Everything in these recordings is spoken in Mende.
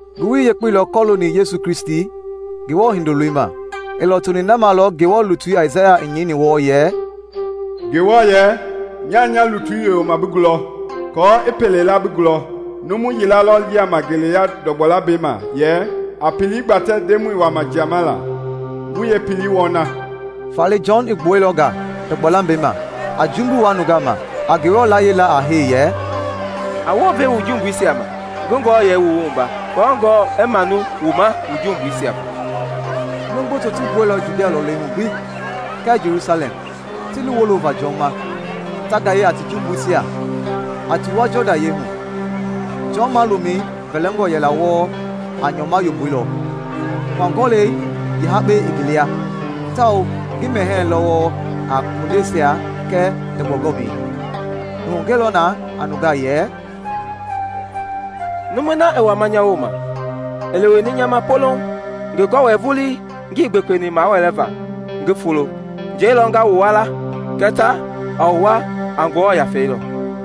Ngowili Yekpei lɔ kɔlooni Yesu Kristi, Ngewɔ Hindoloi ma. I lɔtoni na ma lɔ Ngewɔ lutui Aisaya i nyɛini wɔɔ yɛ, “Ngewɔ yɛ, ‘Nyaa nya lutui yoyoma bi gulɔ aako i pelei la bi gulɔ.’ Numu yila lɔ yiama ngeleya ndɔgbɔ lambɛi ma yɛ, ‘A pelei gbatɛ Ndemɔi i wama jiama la, wu yeepelei wɔna!’” Faale Jɔn i gbuɛilɔ nga ndɔgbɔ lambɛi ma, a jumbui wua nungaa ma, a Ngewɔ layie la a hee yɛ, “A wounve wu jumbuisia ma, ngi wu wua, aako Ngewɔ i manu wu ma wu jumbuisia va.” Numu gboto ti gbuɛilɔ Judia lɔlei hu gbi kɛɛ Jelusalɛm ti li wolova Jɔn ma, ta gaye a ti jumbuisia, a ti wua Jɔdan yɛi hu. Jɔn malomɛi vɛlɛngɔ yɛla wɔɔ a nyɔma yomboi lɔ, hua-gɔlɛi yeehakpɛi i ngi lia, tawao ngi mɛhɛɛ lɔ wɔɔ a kondeisia kɛɛ ndɔgbɔ gɔmii. I hugɛilɔ na a nungaa yɛ, “Numui na i wama nya wooma i leweni nya ma poloŋ, ngi gɔwɛi vulii ngii gbekpeni mawɛɛva ngi fulo. Njɛi lɔ nga wu wua la kɛɛ ta, a wu wua a Ngewɔ Yafei lɔ.”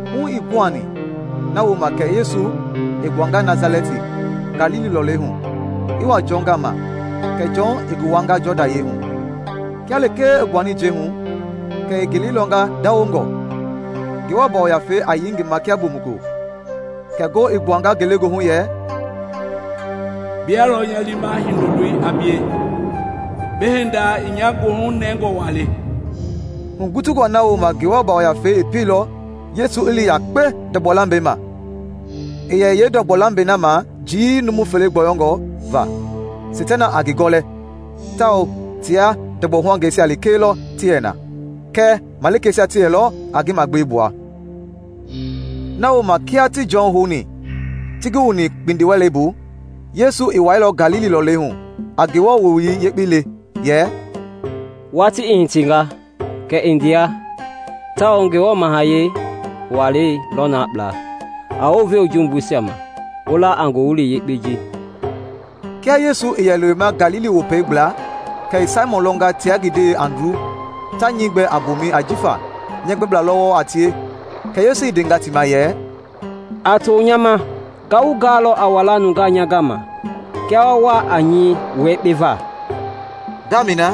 Hu ii guhani na wooma kɛ Yesu i gbuanga Nasalɛti, Galili lɔlei hu, i wa Jɔn gama, kɛ Jɔn i ngi wuanga Jɔdan hu. Kia lekee i gbuani njɛi hu, kɛ i ngelei lɔnga ndawongɔ, Ngewɔ Yafei a yei ngi ma kia bomukulo. Kɛ ngoo i gbuanga ngelegoohu yɛ, “Bia lɔ nya liima Hindoloi a bie, bi hinda i nya goohu nɛngɔ wa le.” Hugutungɔ na wooma Ngewɔ Yafei i pieilɔ Yesu i li yakpe ndɔgbɔ lambɛi ma. I yɛ yeendɔgbɔ lambɛi na ma njii numu fele gbɔyɔngɔ va Seitana a ngi gɔlɛ tawao tia ndɔgbɔ-huangeisia lekee lɔ ti yɛ na; kɛɛ malikeisia ti yɛlɔ a ngi magbewe gbua. Na wooma kia ti Jɔn houni ti ngi wu kpindiwɛlei bu, Yesu i wailɔ Galili lɔlei hu a Ngewɔ Wowili Yekpei le yɛ, “Watii i hitinga, kɛ i ndea, tawao Ngewɔ mahayɛi walei lɔ na kpla. A wounve wu jumbuisia ma, wu la a Ngowili Yekpei ji.” Kia Yesu i yɛ lewema Galili Wopei gbla kɛ i Saimɔn lɔnga tia ngi ndewei Andru ta nyɛi gbɛ a mboomɛi ajifa nyɛɛ gbɛbla lɔ wɔɔ a tie. Kɛ Yesu i ndenga ti ma yɛ, “A to nya ma, nga wu gaalɔ a walaa a nungaa nya gama kia wa wa a nyɛi wua yekpe va.” Ngamɛi na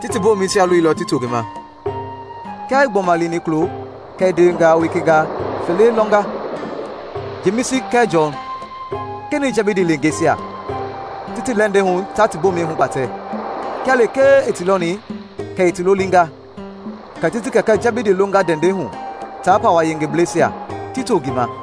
ti ti bomɛisia loilɔ ti to ngi ma. Kia i gbɔma lini kulo kɛ i ndewengaa weka fele lɔnga, Jemisi kɛɛ Jɔn, kenɛi Jɛbidi leengeisia, ti ti lɛndɛi hu ta ti bomɛisia hugbatɛ. Kia lekee i ti lɔni kɛ i ti lolinga; kɛ ti ti kɛkɛ Jɛbidi longa ndɛndɛi hu taa pawa-yengebleisia, ti to ngi ma.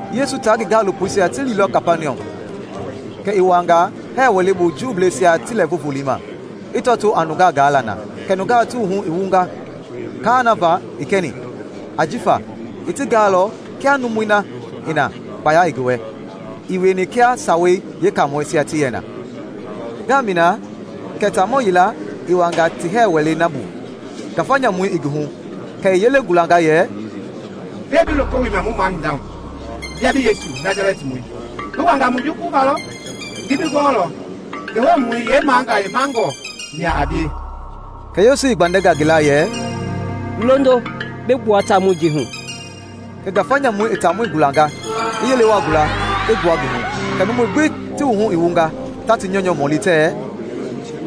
Yesu taa ngi gaalopoisia ti liilɔ Kapaniɔm, kɛ i wuanga hɛɛ wɛlei bu Juubleisia ti Lɛɛvu Volei ma, i tɔtoo a nungaa gaala na. Kɛ nungaa ti wuhu i wunga kaa na va i kɛni, jifa i ti gaalɔ kia numui na i na kpaya i ngi wɛ; ii wieni kia Sawei Yeekaamɔisia ti yɛ na. Ngamɛi na kɛ taamɔ yila i wuaanga ti hɛɛ wɛlei na bu ngafa nyamu i ngi hu; kɛ i yelei gulanga yɛ, “Gbɛe bi loko wilima mu mahinda hu, bia bi Yesu Nasalɛtimɔi? Bi wanga mu jukuluva lɔ? Ngi bi gɔɔlɔ, Ngewɔmɔi yeemagayemangɔ mia a bie.” Kɛ Yesu i gbandɛnga ngi la yɛ, “Londo, bi gbua taamɔi ji hu!” Kɛ ngafa nyamui i taamɔi gulanga, i yele wa gula, i gbua ngi hu. Kɛ numui gbi ti wuhu i wunga, ta ti nyɔunyɔ mɔli tɛɛ,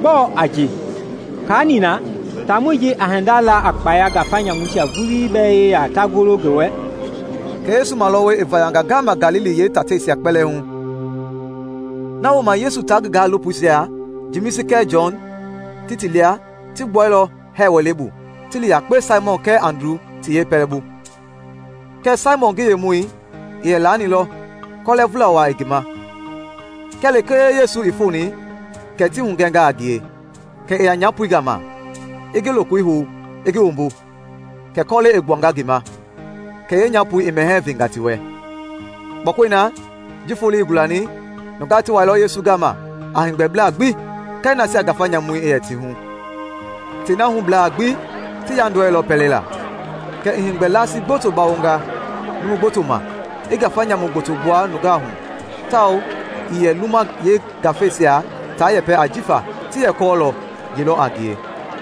“Gbɔɔ a ji? Kaa nina! Taamɔi ji a hinda la a kpaya ngafa nyamuisia vulii bɛɛ yeya ta golo ngi wɛ!” Kɛ Yesu malɔwɔi i vayanga ngama Galili yee taateisia kpɛlɛɛ hu. Na wooma Yesu taa ngi gaalopoisia, Jemisi kɛɛ Jɔn ti ti lia, ti gbuailɔ hɛɛ wɛlei bu ti li yakpe Saimɔn kɛɛ Andru ti yeepɛlɛbu. Kɛɛ Saimɔn ngi yemɔi i yɛ lanilɔ kɔlɛvula wa i ngi ma. Kia lekee Yesu i foni, kɛ ti hugɛnga a ngie. Kɛ i ya nyapoi gama, i ngi lokoi hou, i ngi wumbu, kɛ kɔlɛi i gbuanga ngi ma; kɛ yeenyapoi i mɛhɛɛ venga ti wɛ. Kpɔkɔi na, ji foloi i gulani, nungaa ti wailɔ Yesu gama a heegbɛbla gbi kɛɛ nasia ngafa nyamuisia ti yɛ ti hu. Tei na hublaa gbi ti yaandɔɛilɔ pɛlei la. Kɛ i heegbɛ laasi gboto bawonga numu gboto ma, i ngafa nyamu gboto gbua nungaa hu, tawao ii yɛ luma yeengafeisia taa yɛpɛ ajifa ti yɛ kɔɔlɔ ye lɔ a ngie.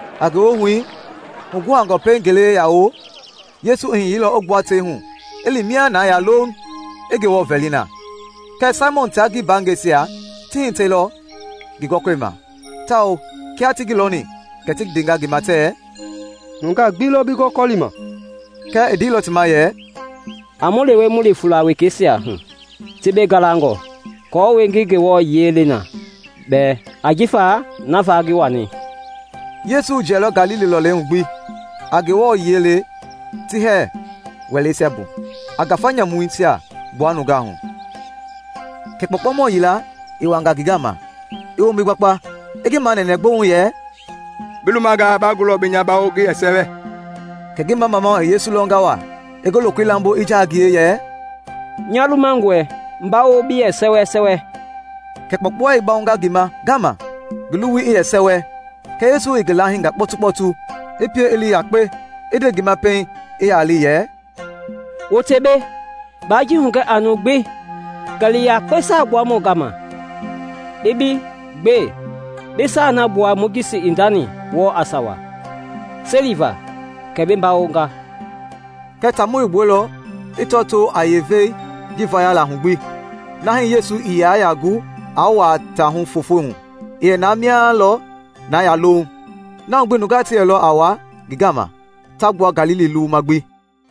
A ngewohui, huguhangɔ pɛiŋ ngele i ya wo, Yesu i hiyeilɔ i gbua tei hu, i li mia na yaa louŋ, i Ngewɔ vɛli na. Kɛɛ Saimɔn taa ngi mbaangɛisia ti hitɛilɔ ngi gɔkɔlima, tawao kia ti ngi lɔni, kɛ ti ndenga ngi ma tɛɛ, “Nungaa gbi lɔ bi gɔkɔlima.” Kɛɛ i ndeilɔ ti ma yɛ, “A mu lewe mu li fuula wekeisia hu ti mbei galangɔ aako ngi Ngewɔ yiɛi le na bɛɛ, ajifa na va lɔ ngi wani.” Yesu i jiɛilɔ Galili lɔlei hu gbi, a Ngewɔ yiɛi le ti hɛɛ wɛleisia bu, a ngafa nyamuisia gbua nungaa hu. Kɛ kpɔukpɔumɔ yila i wanga ngi gama, i wombi gbakpa, i ngi manɛnɛ gbouŋ yɛ, “Bi lumangaa, ba gulɔ bi nya bawo ngi yɛ sɛwɛ.” Kɛ ngi mamamau i Yesu lɔnga wa, i ngi lokoi lambo, i jaa a ngie yɛ, “Nya lumangɔe, bawo bi yɛ sɛwɛ.” Kɛ kpɔukpɔui i bawonga ngi ma ngama, ngi luwui i yɛ sɛwɛ. Kɛ Yesu i ngi laahinga kpɔtukpɔtu, i pie i li yakpe, i nde ngi ma pɛiŋ i ya li yɛ, “Wote mbei, baa ji hugɛ a numu gbi, kɛɛ li yakpe Saa Gbuamɔi gama i bi gbe, bi saai na gbua Mojisi i ndani wɔɔ a sawa, seliva kɛ bi bawonga.” Kɛɛ taamɔi i gbuailɔ i tɔtoo a yeevei ji vayala hu gbi, na hii Yesu ii yɛ yaa gu aa wuaa taa hu foofo hu; i yɛ na mia lɔ na yaa louŋ. Na hu gbi nungaa ti yɛlɔ a wa ngi gama ta gbua Galili luwuma gbi.